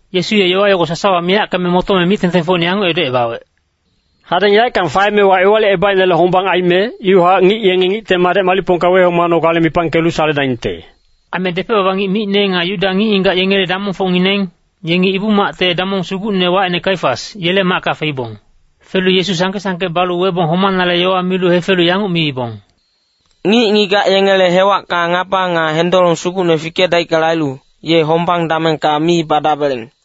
Yesu ye yowa yogo sasawa miyackeme motome mic-tengtengfocine yanguc edocebawec, “Hadeng yaeckang faemewa Ewalicebaicnele hombang aime, iwahac ngic yenge Ngicte Madec malicpongka wehomanogale mipangkelu saledaingte.” Aime depec-baba ngic micne nga Yuda ngic-ngigac yengele damongfocngineng, yengi Ibu-macte damong sugucne wacine Kaifas, yele macka feibong. Felu Yesu sangke-sangke balu webong homanale yowa milu hefelu yanguc miibong, “Ngic-ngigac yengele hewacka ngaba nga hendolong sugucne fikedaickale ailu, ye hombang damengka mi badabeleng.”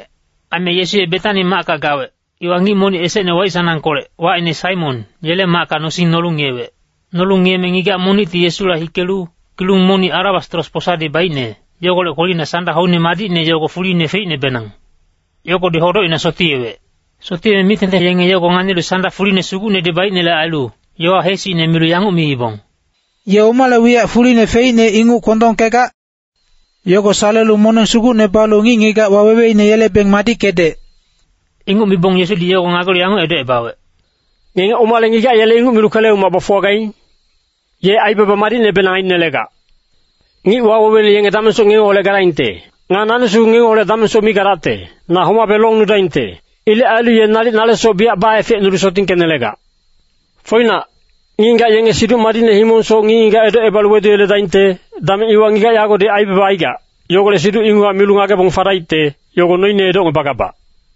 Aime Yesu ye Betani macka gawec, iwa ngic monic esecne waic-sanangkolec, wacine Saimon, yele macka nosing nolu ngiyewec. Nolu ngiyeme ngigac monicti Yesula hikelu, kilung monic alabastros posadi baicne, yogolec kwelina sanda hoine madicne yogo fuline feicnebenang. Yogodi hodocina sotiyewec. Sotiyeme mic-tengteng yenge yogo nganilu sanda fuline sugucnedi baicnele ailu, yowa heesicne milu yanguc miibong, “Ye omale wiyac fuline feicne inguc kwondongkegac? Yogo salelu moneng sugucne balu ngic-ngigac waweweine yelebeng madickedec.” Inguc mibong Yesudi yogo ngagelu yanguc edocebawec, “Ngenge omale ngigac yele inguc milu kwele-umac bafuwagaing? Ye aibaba madicnebenang ainelegac. Ngic waweweine yenge damengsoc ngengeholec gadaingte. Nga nani sugu ngengeholec damengsoc mi gadacte. Na homabe longnudaingte. Ilec ailu ye nalic nale soc biyac baefecnulu sotingkenelegac. Foinac, ngic-ngigac yenge Siduc Madicne himongsoc ngic-ngigac edocebalu weduyeledaingte, dameng iwa ngigac yagodi aibaba aigac, yogolec siduc inguchac milu ngagebong fadaicte, yogo noine edocngebagabac.”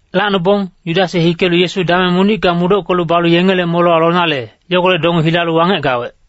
Lacnobong, Yudas ye hikelu Yesu dameng monicka mudockelu balu yengele molewa lonale, yogolec donge hilalu wangec gawec.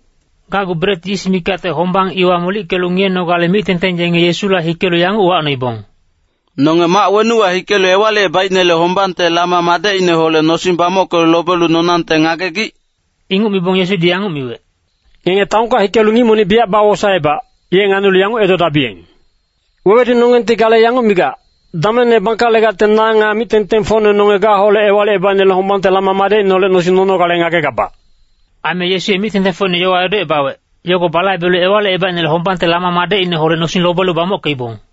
Gacgu bret yis mikacte hombang iwa molickelu ngiyenogale mic-tengteng yenge Yesula hikelu yanguc uwacnoibong, “Nonge mac wenuwa hikelu Ewalicebaicnele hombangte lama madecineholec nosing bamockelu lobelu nonangte ngagegic?” Inguc mibong Yesudi yanguc miwec, “Ngenge taonka hikelu ngic monic biyac bawosaebac, ye nganilu yanguc edodabiyeng. ‘Wewedunonggengti gale yanguc migac, “Damengne bangkalegacte na nga mic-tengtengfocne nonge gaholec Ewalicebaicnele hombangte lama madecineholec nosing nonogale ngagegabac.”’” Aime Yesu ye mic-tengtengfocine yowa edocebawec, yogo balaibelu Ewalicebaicnele hombangte lama madecineholec nosing lobelu bamockeibong.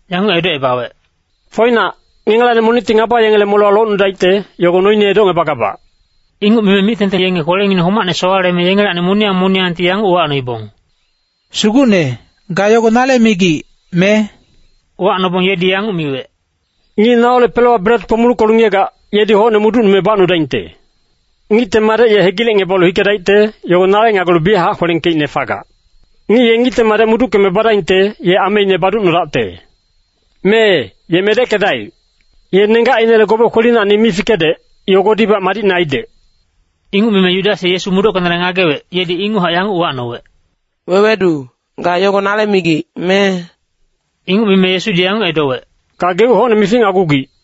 yanguc edocebawec, “Foinac, ngengelacni monicti ngaba yengele molewa locnudaicte, yogo noine edocngebagabac.” Inguc mime mic-tengteng yenge kwelengineng homacne sowaleme yengelacni moniyang moniyangti yanguc uwacnoibong, “Sugucne, ga yogo nale migic, me?” Uwacnobong yedi yanguc miwec, “Ngic naholec pelewa bret kpomuluckelu ngiyegac, yedi hocne mudocnume bacnudaingte. Ngicte Madec ye hegilecngebalu hikedaicte, yogo nale ngagelu biyachac kwelengkeicne fagac. Ngic ye Ngicte Madec mudockeme badaingte, ye ameine baducnodaicte. Mee, ye medeckedaic. Ye nenggacinele gobe kwelinacni mi fikedec, yogodibac madicne aidec.” Inguc mime Yudas ye Yesu mudockenale ngagewec, yedi inguchac yanguc uwacnowec, “Wewedu, ga yogo nale migic, me?” Inguc mime Yesudi yanguc edowec, “Gageuc hocne mificnagugic.”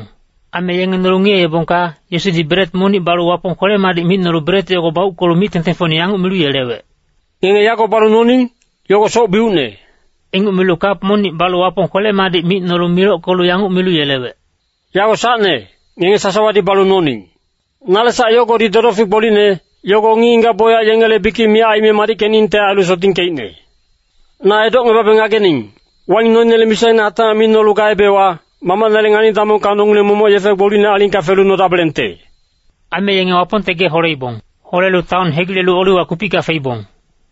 Aime yenge nolu ngiyeebongka, Yesudi bret monic balu Wapong kwele-madic micnolu bret yogo bauckelu mic-tengtengfocine yanguc milu yelewec, “Ngenge yago balu noning, yogo soc-biucne.” Inguc milu kap monic balu Wapong kwele-madic micnolu milockelu yanguc milu yelewec, “Yago sacne, ngenge sasawadi balu noning. Nale sac yogodi dodofic gbolicne, yogo ngic-ngigac bocyac yengele bikic miyac aime madickeningte ailu sotingkeicne. Na edocngebabe ngagening, waing noinele misaine hatacmac mi nolu gaebewa, Mamacnele ngani-damongka nongileng momoc yefe gbolicnele alingka felu nodabelengte.” Aime yenge Wapongte gee holeibong. Holelu taon hegilelu Oliwa kupicka feibong.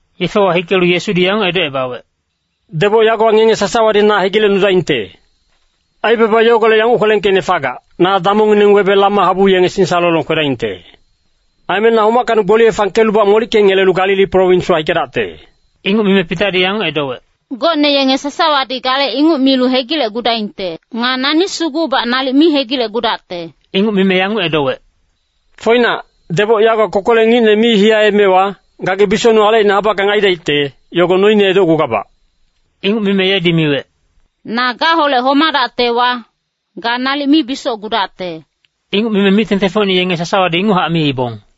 Yefewa hikelu Yesudi yanguc edocebawec, “Deboc yagowa ngenge sasawadi na hegilecnudaingte. Aibaba yogolec yanguc kwelengkeicne fagac, ‘Na damongngineng webe lama habu yenge singsalolong kwedaingte.’ Aime na homackacni gboliye fangkelubac molickengelelu Galili prowinswa hikedacte.” Inguc mime Pitadi yanguc edowec, “Gocne yenge sasawadi gale inguc milu hegilecgudaingte. Nga nani sugubac nalic mi hegilecgudacte.” Inguc mime yanguc edowec, “Foinac, deboc yagowa kokolec ngicne mi hiyaemewa, gagi bisocnung alecine habackang aidaicte, yogo noine edocgugabac.” Inguc mime yedi miwec, “Na gaholec homadactewa, ga nalic mi bisocgudacte.” Inguc mime mic-tengtengfocine yenge sasawadi inguchac miibong.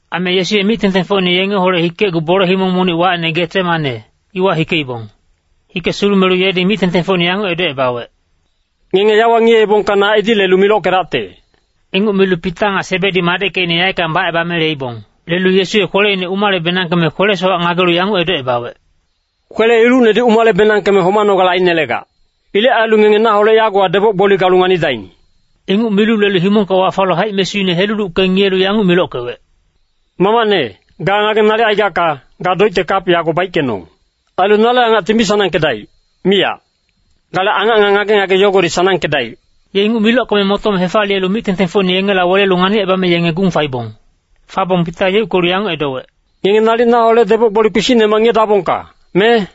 Aime Yesu ye mic-tengtengfocine yengeholec hikecgu bole himong monic wacine Getsemane, iwa hikeibong. Hike sulumelu yedi mic-tengtengfocine yanguc edocebawec, “Ngenge yawa ngiyeebongka na edi lelu milockedacte.” Inguc milu Pita nga Sebedi madeckecine yaeckang bacebame leibong. Lelu Yesu ye kweleine umalebenangkeme kwele-sowac ngagelu yanguc edocebawec, “Kwele-ilucnedi umale-benangkeme homanogale ainelegac. Ilec ailu ngenge naholec yagowa deboc-gboli galu nganidaing.” Inguc milu lelu himongka wafalu haic-mesuine helulucke ngiyelu yanguc milockewec, “Mamacne, ga ngageng nalic aigacka, ga doicte kap yago baickenong. Ailu nale angacti mi sanangkedaic, miyac. Gale angac nga ngage-ngage yogodi sanangkedaic.” Ye inguc milockeme motome hefaliyelu mic-tengtengfocine yengela welelu nganicebame yenge gung faibong. Fabong Pita yeuckelu yanguc edowec, “Ngenge nalic naholec deboc-gboli kpisicnemac ngiyedabongka, me?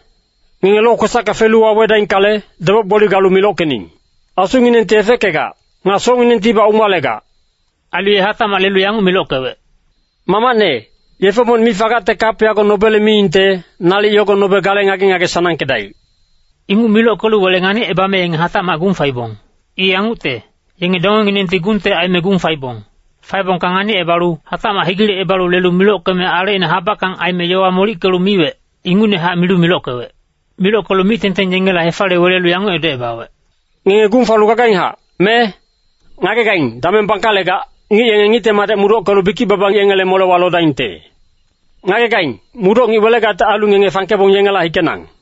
Ngenge lokwesacka felu wawedaingkale, deboc-gboli galu milockening! Asunginengti efeckegac. Nga socnginengtibac umalegac.” Ailu ye hatacmac lelu yanguc milockewec, “Mamacne, yefe monic mi fagacte kap yago nobele miingte, nalic yogo nobe gale ngage-ngage sanangkedaic.” Inguc milockelu wele nganicebame yenge hatacmac gung faibong. I yangucte, yenge dongenginengti gungte aime gung faibong. Faebongka nganicebalu hatacmac hegilecebalu lelu milockeme alecine habackang aime yowa molickelu miwec, ingucnehac milu milockewec. Milockelu mic-tengteng yengela hefaliye welelu yanguc edocebawec, “Ngenge gung falu gagainghac, me? Ngagegaing, dameng bangkalegac, ngic yenge Ngicte Madec mudockelu bikic-baba yengele molewa lodaingte. Ngagegaing, mudoc ngic welegacte ailu ngenge fangkebong yengela hikenang.”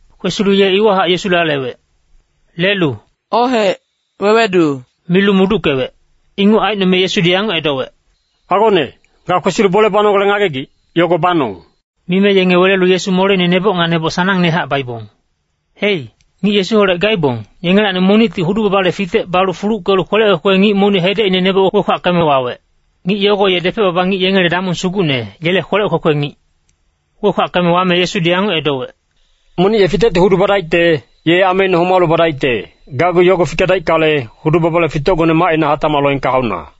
Kwesilu ye iwahac Yesula lewec. Lelu “Ohec, wewedu” milu muduckewec. Inguc aicnome Yesudi yanguc edowec, “Agone, ga kwesilu bole banogale ngagegic, yogo banong.” Mime yenge welelu Yesu moleine neboc nga neboc sanangnehac baibong. Hei, ngic Yesuholec gaibong, yengelacni monicti hudu-babale fitec balu fuluckelu kwelec kwekwe ngic monic hedecine neboc wekwackeme wawec. Ngic yogo ye depec-baba ngic yengele damong sugucne, yele kwelec kwekwe ngic. Wekwackeme wame Yesudi yanguc edowec, “Monic ye fitecti hudu badaicte, ye ameine homalu badaicte, gacgu yogo fikedaickale, hudu-babale fitecgone macina hatacmac loengka hauna.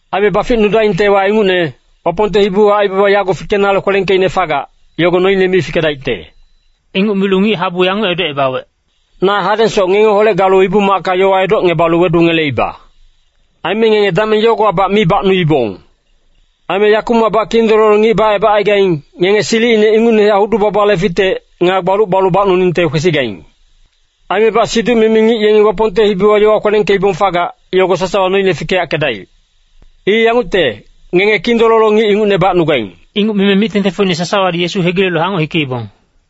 Aime baficnudaingtewa ingucne, Wapongte hibiwa aibaba yago fikenale kwelengkeicne fagac, yogo noine mi fikedaicte.” Inguc milu ngic-habu yanguc edocebawec, “Na hadengsoc ngengeholec galu Ibu-macka yowa edocngebalu wedungeleiba. Aime ngenge dameng yogowabac mi bacnuibong. Aime yakumacbac kindololo ngic bacebacaigaing, ngenge silicine ingucnehac hudu-babale fitec, nga gbaluc balu bacnuningte kwesigaing. Aimebac siduc-mimi ngic yengi Wapongte hibiwa yowa kwelengkeibong fagac, yogo sasawa noine fikeyackedaic. I yangucte, ngenge kindololo ngic ingucne bacnugaing.” Inguc mime mic-tengtengfocine sasawadi Yesu hegilelu hangoc hikeibong.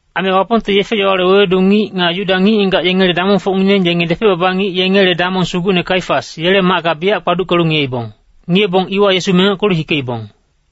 Aime Wapongte yefe-yowale wewedu ngic nga Yuda ngic-ngigac yengele damongfocngineng yenge depec-baba ngic yengele damong sugucne Kaifas, yele macka biyac kpaduckelu ngiyeibong. Ngiyebong iwa Yesu mengockelu hikeibong.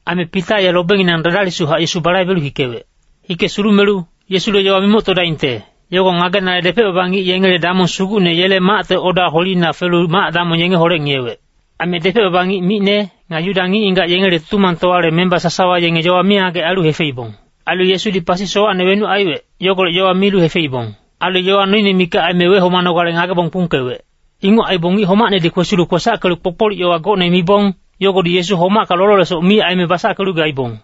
Aime Pita ye lobenginang dadalisuchac Yesu balaibelu hikewec. Hike sulumelu, Yesule yowa mimoctodaingte, yogo ngagenale depec-baba ngic yengele damong sugucne yele macte oda kwelina felu mac-damong yengeholec ngiyewec. Aime depec-baba ngic micne, nga Yuda ngic-ngigac yengele Tutumangtowale memba sasawa yenge yowa mingagec ailu hefeibong. Ailu Yesudi pasi sowacne wenuc aiwec, yogolec yowa milu hefeibong. Ailu yowa noine mikac aime wehomanogale ngagebong kpungkewec. Inguc aibong ngic homacnedi kwesilu kwesackelu kpokpolic yowa gocne mibong, yogodi Yesu homacka lololesoc mi aime basackelu gaibong.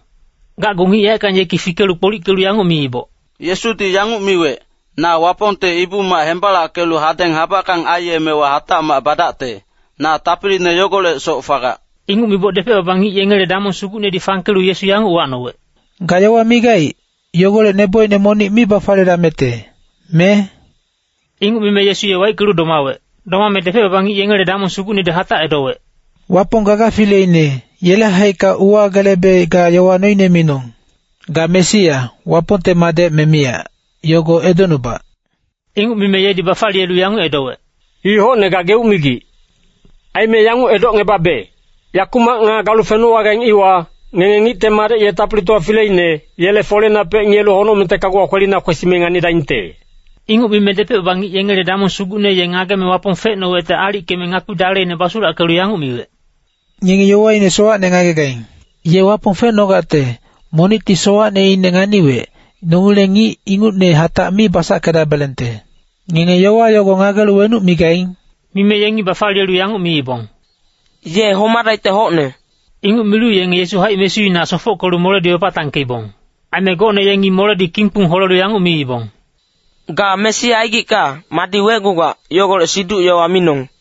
Gacgu ngic yaeckang yeki fikelu kpolickelu yanguc miiboc, “Yesudi yanguc miwec, ‘Na Wapongte Ibu-mac hembalackelu hadeng habackang aiyemewa hatacmac badacte, na tapiline yogolecsoc fagac.’” Inguc miboc depec-baba ngic yengele damong sugucnedi fangkelu Yesu yanguc uwacnowec, “Ga yowa migaic, yogolec nebocine monic mi bafaliyedamecte, me?” Inguc mime Yesu ye waickelu domawec. Domame depec-baba ngic yengele damong sugucnedi hatac edowec, “Wapong gaga fileine, yele haicka uwagelebe ga yowa noine minong. Ga Mesia, Wapongte madec me miyac, yogo edocnubac.” Inguc mime yedi bafaliyelu yanguc edowec, “I hocne gageuc migic. Aime yanguc edocngebabe, yakumac nga galu fenowagaing iwa, Ngenge Ngicte Madec ye Tapilitowa fileine, yele foleinapec ngiyelu honocmengte kaguwa kwelina kwesime nganidaingte.” Inguc mime depec-baba ngic yengele damong sugucne ye ngageme Wapong fecnowecte aalickeme ngakpi daleine basulackelu yanguc miwec, “Ngenge yowaine sowacne ngagegaing. Ye Wapong fecnogacte, monicti sowacneine nganiwec, nongileng ngic ingucne hatac mi basackedabelengte. Ngenge yowa yogo ngagelu wenuc migaing?” Mime yengi bafaliyelu yanguc miibong, “Ye homadaicte hocne.” Inguc milu yenge Yesu haic-mesuina sofockelu moledi wepatangkeibong. Aime gocne yengi moledi kingkpung holelu yanguc miibong, “Ga Mesia aigicka, madi wecgugac, yogolec siduc-yowa minong!”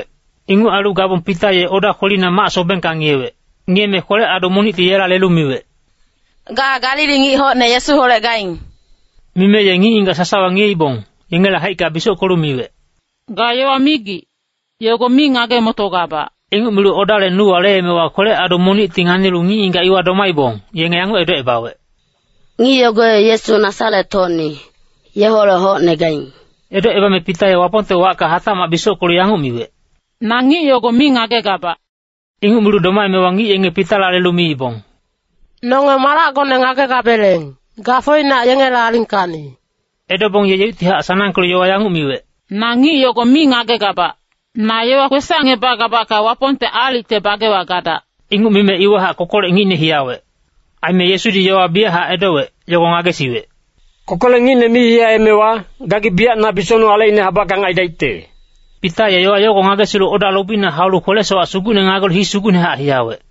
Inguc ailu gabong Pita ye oda kwelina mac-sobengka ngiyewec. Ngiyeme kwelec-adu monicti yela lelu miwec, “Ga Galili ngic hocne Yesuholec gaing.” Mime ye ngic-ngigac sasawa ngiyeibong, yengele haicka bisockelu miwec, “Ga yowa migic, yogo mi ngage-motogabac.” Inguc milu odale nuwa leemewa kwelec-adu monicti nganilu ngic-ngigac iwa domaibong, yenge yanguc edocebawec, “Ngic yogo ye Yesu Nasaret-hocni, yeholec hocne gaing.” Edocebame Pita ye Wapongte wacka hatacmac bisockelu yanguc miwec, “Na ngic yogo mi ngagegabac.” Inguc milu domaemewa ngic yenge Pitala lelu miibong, “Nonge malacgone ngagegabeleng, ga foinac yengele alingkacni.” Edobong ye yeuctihac sanangkelu yowa yanguc miwec, “Na ngic yogo mi ngagegabac. Na yowa kwesacngebagabacka Wapongte aalicte bagewa gadac.” Inguc mime iwahac kokolec ngicne hiyawec. Aime Yesudi yowa biyachac edowec, yogo ngagesiwec, “Kokolec ngicne mi hiyaemewa, gagi biyac na bisocnung alecine habackang aidaicte.” Pita ye yowa yogo ngagesilu oda lobina haulu kwele-sowac sugucne ngagelu hii sugucnehac hiyawec.